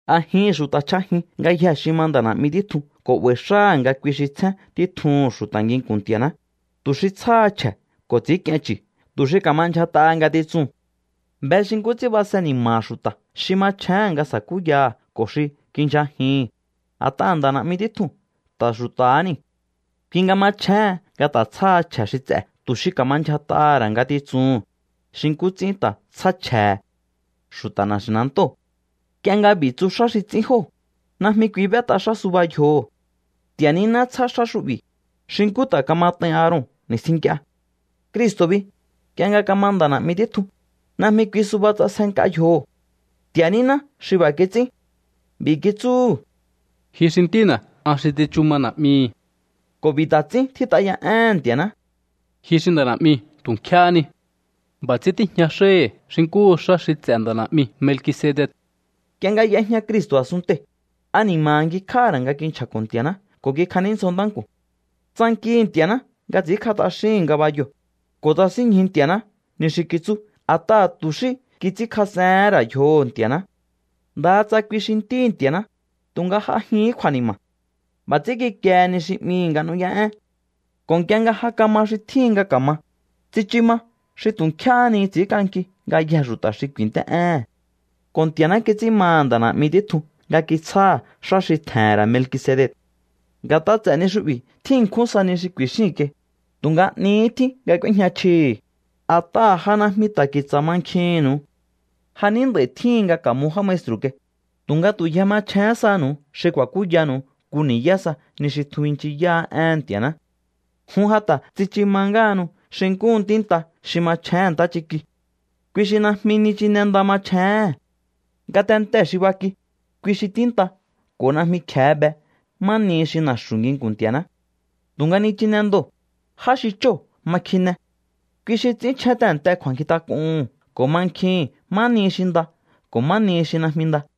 A̱jihi̱n xu̱ta̱ chj'ajin ngayjee̱ xi ma nda̱ na̱'mi títjun ko̱ 'ba̱i̱ xáha̱ nga kui xi tsjén títjuhu̱n xu̱ta̱ nginku̱n Nti̱a̱ná, tu̱ xi tsjáha chje̱ ko̱ ts'i̱ínk'ien chu̱ tu̱ xi ka̱ma ndyjat'aha ngatitsuu̱n. Be xi nkú ts'ín base ni̱ma̱ha̱ xu̱ta̱ xi machjéhe̱n nga sa̱kúyaha̱ ko̱ xi kindyjajihi̱n, a̱t'aha̱ nda̱ na̱'mi títjuu̱n ta̱ xu̱ta̱há niu̱. Kui nga machjéhen nga ta̱ tsjáha chje̱ xi ts'e̱ tu̱ xi ka̱ma ndyjat'aha̱ ra̱ ngatitsuhu̱n, xi nkú ts'ín ta̱ tsjá chje̱he̱ xu̱ta̱ na̱xi̱nantóo̱. Nk'ie nga b'i̱ tsu xá xi ts'ín jóo̱, najmi kui b'et'a xá suba yjoho̱. Nti̱a̱ níná tsjá xá xu'bi̱, xi nkú ta̱ kamat'ain Aaron ni̱stjin nk'ie. Cristo̱ bi, nk'ie nga kama nda̱ na̱'mi títjun, najmi kui suba ts'asje nk'a yjoho̱. Nti̱a̱ níná xi b'a̱ kits'ín. B'i̱ kitsúhu̱: Ji xi Ntína̱, an xi tsichu ma Na̱'mihi̱. Ko̱ b'i̱ ta̱ ts'ín tjít'a ya éhe̱n Nti̱a̱ná: Ji xi nda̱ na̱'mi tu̱ nk'éhé ni. B'a̱ ts'ín tíjña xáhi̱ xi nkúhu xá xi ts'e̱ nda̱ na̱'mi Melkisedec. Nk'ie nga y'ejña Cristo̱ a̱sunntei̱, ani̱ma̱ha̱ ngjikj'áha̱ ra̱ nga kinchja̱ko̱ Nti̱a̱ná ko̱ kikjaníndzjo ntánku̱n. Tsankihi̱ Nti̱a̱ná nga ts'i̱ínkj'a t'axíhi̱n ngabayoo̱, ko̱ tsasínñju Nti̱a̱ná ni xi kitsú a̱t'aha̱ tu̱ xí kits'ínkjas'ehén ra̱ yjoho̱ Nti̱a̱ná. Ndaha tsa kui xi Ntíhi̱ Nti̱a̱ná, tu̱nga j'ajihín kju̱a̱ni̱ma̱. B'a̱ ts'ín kikiehe ni xi 'mihi̱ nga nu̱ú'yá'één. Ko̱ nk'ie nga ja kama xi tjíhin nga ka̱ma, tsichu ma xi tu̱ nkjéhé ni ts'i̱ínk'anki ngayjee̱ xu̱ta̱ xi ku̱i̱nt'é'éhe̱n. Ko̱ Nti̱a̱ná kits'ín maha̱ nda̱ na̱'mi títjun nga kitsjáha̱ xá xi tje̱he̱n ra̱ Melkisedec. Nga̱t'a ts'e̱ ni xu'bi̱ tjín ṉkjún sa ni xi ku̱i̱xíi̱n kai, tu̱nga 'nihí tjín nga k'úéjña chjii̱hi̱, a̱t'aha̱ ja najmi ta̱ ki̱tsa̱ mankjihi̱nnu̱u. Ja ní nd'a̱i tjíhin nga ka̱mo já maestru̱ kai, tu̱nga tu̱ yje machjén saha̱nu̱u xi ku̱a̱kúyanu̱u nku ni̱yá sa ni xi tjun binchiyáá éhe̱n Nti̱a̱ná. Jun ja ta̱ tsichu ma ngáhanu xi nkúhu ntínta xi machjéhe̱n ntáchiki. Kui xi najmi nichine nda machjéhe̱n. Ngatentee̱ xi baki, kui xi ntínta ko̱ najmi kje̱e be má nihi xi na̱xu̱ nginku̱n Nti̱a̱ná. Tu̱nga nichine ndoo̱, já xi chóo̱ ma kjine. Kui xi ts'ínchjén tehe̱nte kju̱a̱nkjintak'uhu̱n ko̱ mankjihi̱n má nihi xi nda ko̱ má nihi xi najmi nda.